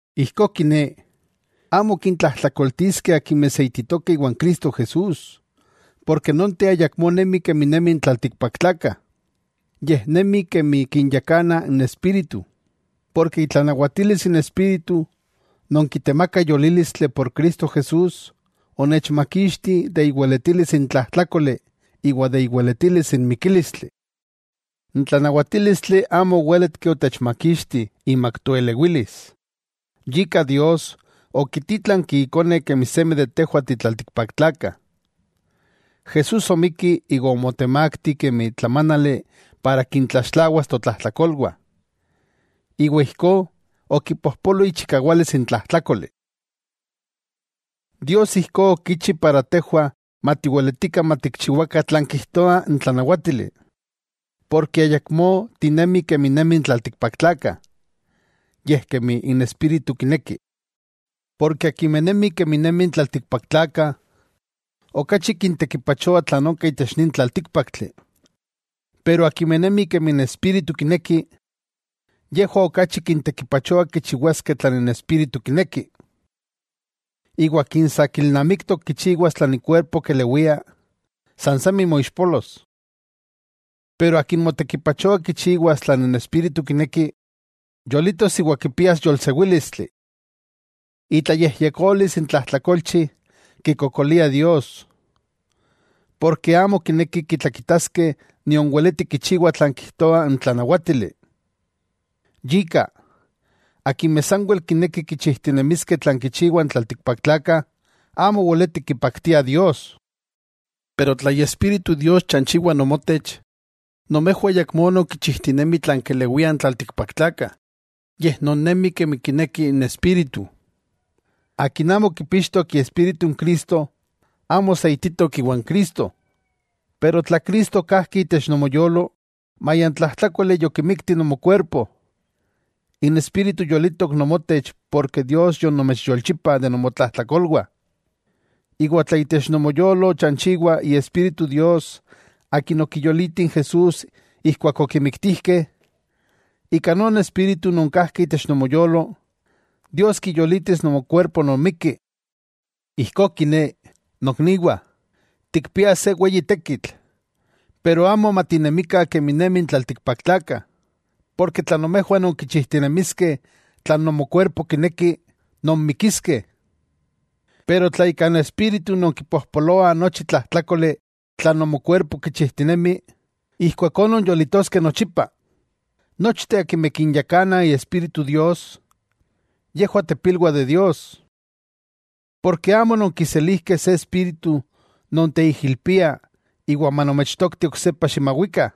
Ijkó kiné, amo kintlajtlakoltiskeh akimeh seititokeh iwan Cristo Jesús, porke nonteh ayakmó nemi kemi nemi n tlaltikpaktlakah, yej nemi kemi kinyakana n Espíritu. Porke itlanawatilis n Espíritu non kitemaka yolílistli por Cristo Jesús onechmakixti imak iweletilis n tlajtlákoli iwa imak iweletilis n mikílistli. N tlanawatílistli amo owéletki otechmakixti imak toelewilis, yika Dios okitítlanki Ikone kemi seme de tejwah ti tlaltikpaktlakah. Jesús omikki iwa omotemakti kemi tlamánali para kintlaxtlawas totlajtlakolwah, iwa ijkó okipojpolo ichikawalis n tlajtlákoli. Dios ijkó okichi para tejwah matiweletikah matikchiwakah tlan kijtoa n tlanawátili, porke ayakmó tinemih kemi nemi n tlaltikpaktlakah, yej kemi n Espíritu kineki. Porke akimeh nemih kemi nemi n tlaltikpaktlakah, okachi kintekipachoa tlan onka itech nin tlaltíkpaktli, pero akimeh nemih kemi n Espíritu kineki, yejwah okachi kintekipachoa kichiwaskeh tlan n Espíritu kineki. Iwa akin sa kilnamiktok kichiwas tlan ikuerpo kelewia, san semi moixpolos. Pero akin motekipachoa kichiwas tlan n Espíritu kineki, yolitos iwa kipias yolsewílistli. Itlayejyekolis n tlajtlakolchi kikokoliah Dios. Porke amo kinekih kitlakitaskeh nion weletih kichiwah tlan kijtoa n tlanawátili. Yika, akimeh sanwel kinekih kichijtinemiskeh tlan kichiwah n tlaltikpaktlakah amo weletih kipaktiah Dios. Pero tla Iespíritu Dios chanchiwa nomotech, nomejwah ayakmó nonkichijtinemih tlan kelewiah n tlaltikpaktlakah, yej nonnemi kemi kineki n Espíritu. Akin amo kipixtok Iespíritu n Cristo, amo seititok iwan Cristo. Pero tla Cristo kajki itech nomoyolo, maya n tlajtlákoli yokimikti nomokuerpo, n Espíritu yolitok nomotech porke Dios yonomechyolchipa de nomotlajtlakolwah. Iwa tla itech nomoyolo chanchiwa Iespíritu Dios Akin okiyoliti n Jesús ijkuak okimiktijkeh, ika non Espíritu non kajki itech nomoyolo, Dios kiyolitis nomokuerpo non mikki. Ijkó kiné, nokniwah, tikpiah se weyi tekitl, pero amo matinemikah kemi nemi n tlaltikpaktlakah. Porke tla nomejwah nonkichijtinemiskeh tlan nomokuerpo kineki, nonmikiskeh. Pero tla ika n Espíritu nonkipojpoloah nochi tlajtlákoli tlan nomokuerpo kichijtinemi, ijkuakó nonyolitoskeh nochipa. Nochteh akimeh kinyakana Iespíritu Dios, yejwah tepilwah de Dios. Porke amo ononkiselijkeh se espíritu non teijilpia iwa manomechtokti oksepa ximawikah,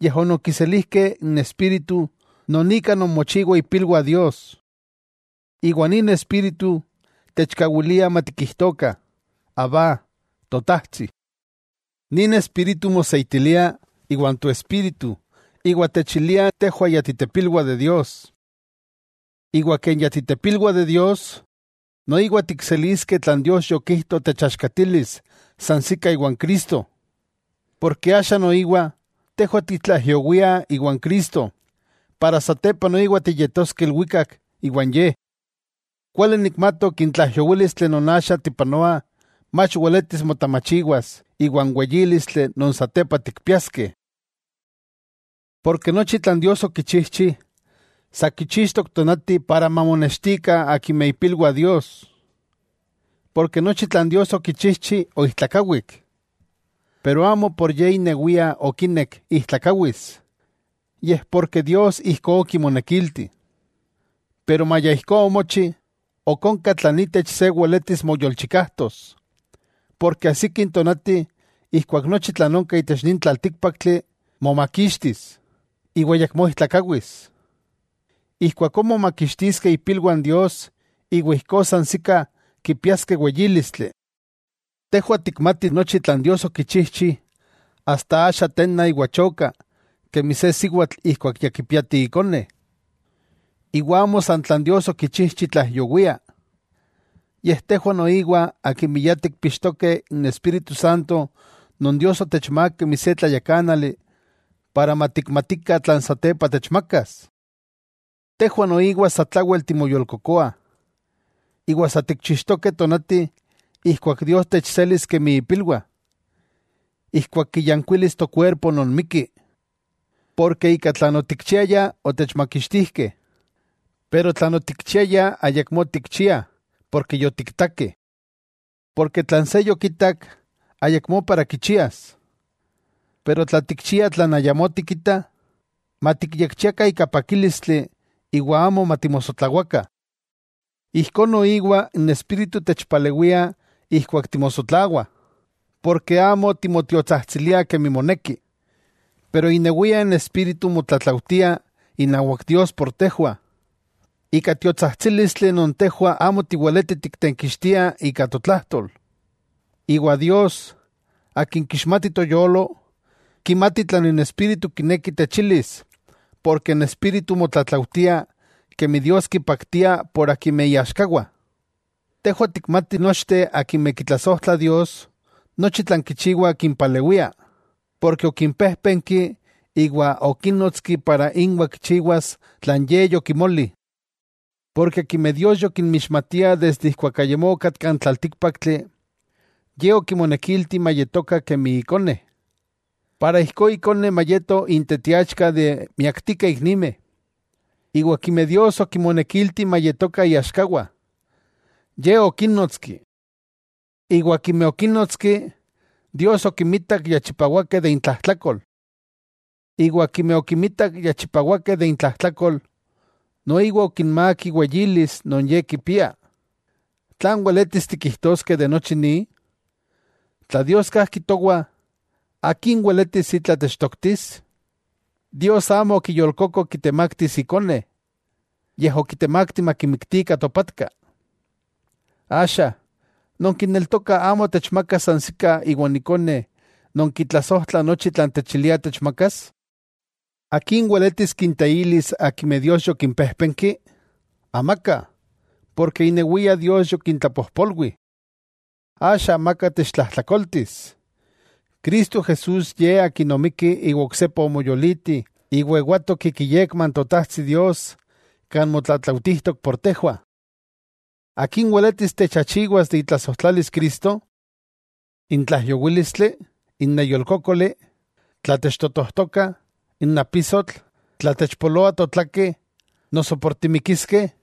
yej ononkiselijkeh n Espíritu non ika nonmochiwah ipilwah Dios. Iwa nin Espíritu techkawilia matikijtokah: “¡Abba, Totajtsi!” Nin Espíritu moseitilia iwan toespíritu iwa techilia tejwah ya ti tepilwah de Dios. Iwa ken ya titepilwah de Dios, noiwa tikseliskeh tlan Dios yokijto techtlaaxkatilis sansikah iwa n Cristo, porke axa noiwa tejwah titlaijyowiah iwa n Cristo para satepa noiwa tiyetoskeh ilwikak iwan Ye. Kuali nikmatok n tlaijyowílistli non axa tipanoah mach weletis motamachiwas iwa n weyílistli non satepa tikpiaskeh. Porke nochi tlan Dios okichijchi, sa kichixtok tonati para mamonextikah akimeh ipilwah Dios. Porke nochi tlan Dios okichijchi oijtlakawik, pero amo por ye inewia okinek ijtlakawis, yej porke Dios ijkó okimonekilti. Pero maya ijkó omochi, ok onka tlan itech se weletis moyolchikajtos porke ajsiki n tonati ijkuak nochi tlan onka itech nin tlaltíkpaktli momakixtis, iwa ayakmó ijtlakawis. Ijkuakó momakixtiskeh ipilwah n Dios iwa ijkó sansikah kipiaskeh weyílistli. Tejwah tikmatih nochi tlan Dios okichijchi asta axa tenna iwa choka kemi se siwatl ijkuak ya kipiati ikone. Iwa amo san tlan Dios okichijchi tlaijyowia, yej tejwah noiwa akimeh ya tikpixtokeh n Espíritu Santo non Dios yotechmák kemi se tlayakánali para matikmatikah tlan satepa techmakas. Tejwah noiwa satlawel timoyolkokoah, iwa sa tikchixtokeh tonati ijkuak Dios techselis kemi ipilwah, ijkuak kiyankuilis tokuerpo non mikki. Porke ika tlan otikchiayah otechmakixtijkeh; pero tlan otikchiayah ayakmó tikchiah porke yotiktakeh. Porke tlan se yokitak, ayakmó para kichias. Pero tla tikchiah tlan ayamó tikitah, matikyekchiakah ika pakílistli iwa amo matimosotlawakah. Ijkó noiwa n Espíritu techpalewia ijkuak timosotlawah. Porke amo timotiotsajtsiliah kemi moneki, pero inewia n Espíritu motlatlaujtia inawak Dios por tejwah, ika tiotsajtsílistli non tejwah amo tiweletih tiktenkixtiah ika totlajtol. Iwa Dios, Akin kixmati toyolo, kimati tlan n Espíritu kineki techilis porke n Espíritu motlatlaujtia kemi Dios kipaktia por akimeh iaxkawah. Tejwah tikmatih nochteh akimeh kitlasojtlah Dios, nochi tlan kichiwah kimpalewia, porke okimpejpenki iwa okinnotski para inwa kichiwas tlan Ye yokimoli. Porke akimeh Dios yokinmixmatia desde ijkuak ayamó okatka n tlaltíkpaktli, Ye okimonekilti mayetokah kemi Ikone, para ijkó Ikone mayeto intetiachka de miaktikeh iknimeh. Iwa akimeh Dios okimonekilti mayetokah iaxkawah, Ye okínnotski. Iwa akimeh okínnotski, Dios okimitak ya chipawakeh de intlajtlakol. Iwa akimeh okimitak ya chipawakeh de intlajtlakol, noiwa okinmák iweyilis non Ye kipia. ¿Tlan weletis tikijtoskeh de nochi ni? Tla Dios kajki towah, ¿akin weletis itla techtoktis? Dios amo okiyolkoko kitemaktis Ikone, yej okitemakti makimiktikah topatka. Axa ¿nonkineltokah amo techmakas sansikah iwan Ikone non kitlasojtla nochi tlan techilia techmakas? ¿Akin weletis kinteilis akimeh Dios yokimpéjpenki?, amaka, porke inewia Dios yokintlapojpolwi. ¡Axa amaka techtlajtlakoltis! Cristo Jesús Ye Akin omikki iwa oksepa omoyoliti iwa ewatok ik iyekma n Totajtsi Dios kan motlatlaujtijtok por tejwah. ¿Akin weletis techachiwas de itlasojtlalis Cristo? ¿N tlaijyowílistli, n neyolkókoli, tla techtotojtokah, n apisotl, tla techpoloa totlakeh noso por timikiskeh?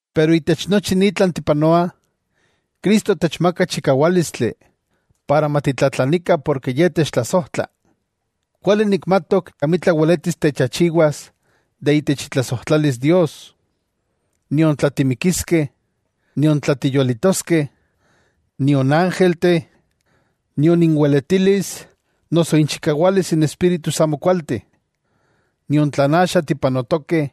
Pero itech nochi ni tlan tipanoah, Cristo techmaka chikawálistli para matitlatlanikah porke Ye techtlasojtla. Kuali nikmatok amitla weletis techachiwas de itech itlasojtlalis Dios. Nion tla timikiskeh, nion tla tiyolitoskeh, nion ángelteh, nion inweletilis noso inchikawalis n espíritus amokualteh, nion tlan axa tipanotokeh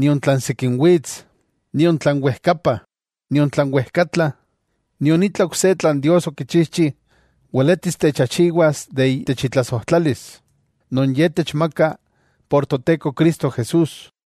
nion tlan sikin wits, nion tlan wejkapa, nion tlan wejkatla, nion itla ok se tlan Dios okichijchi weletis techachiwas de itech itlasojtlalis, non Ye techmaka por Toteko Cristo Jesús.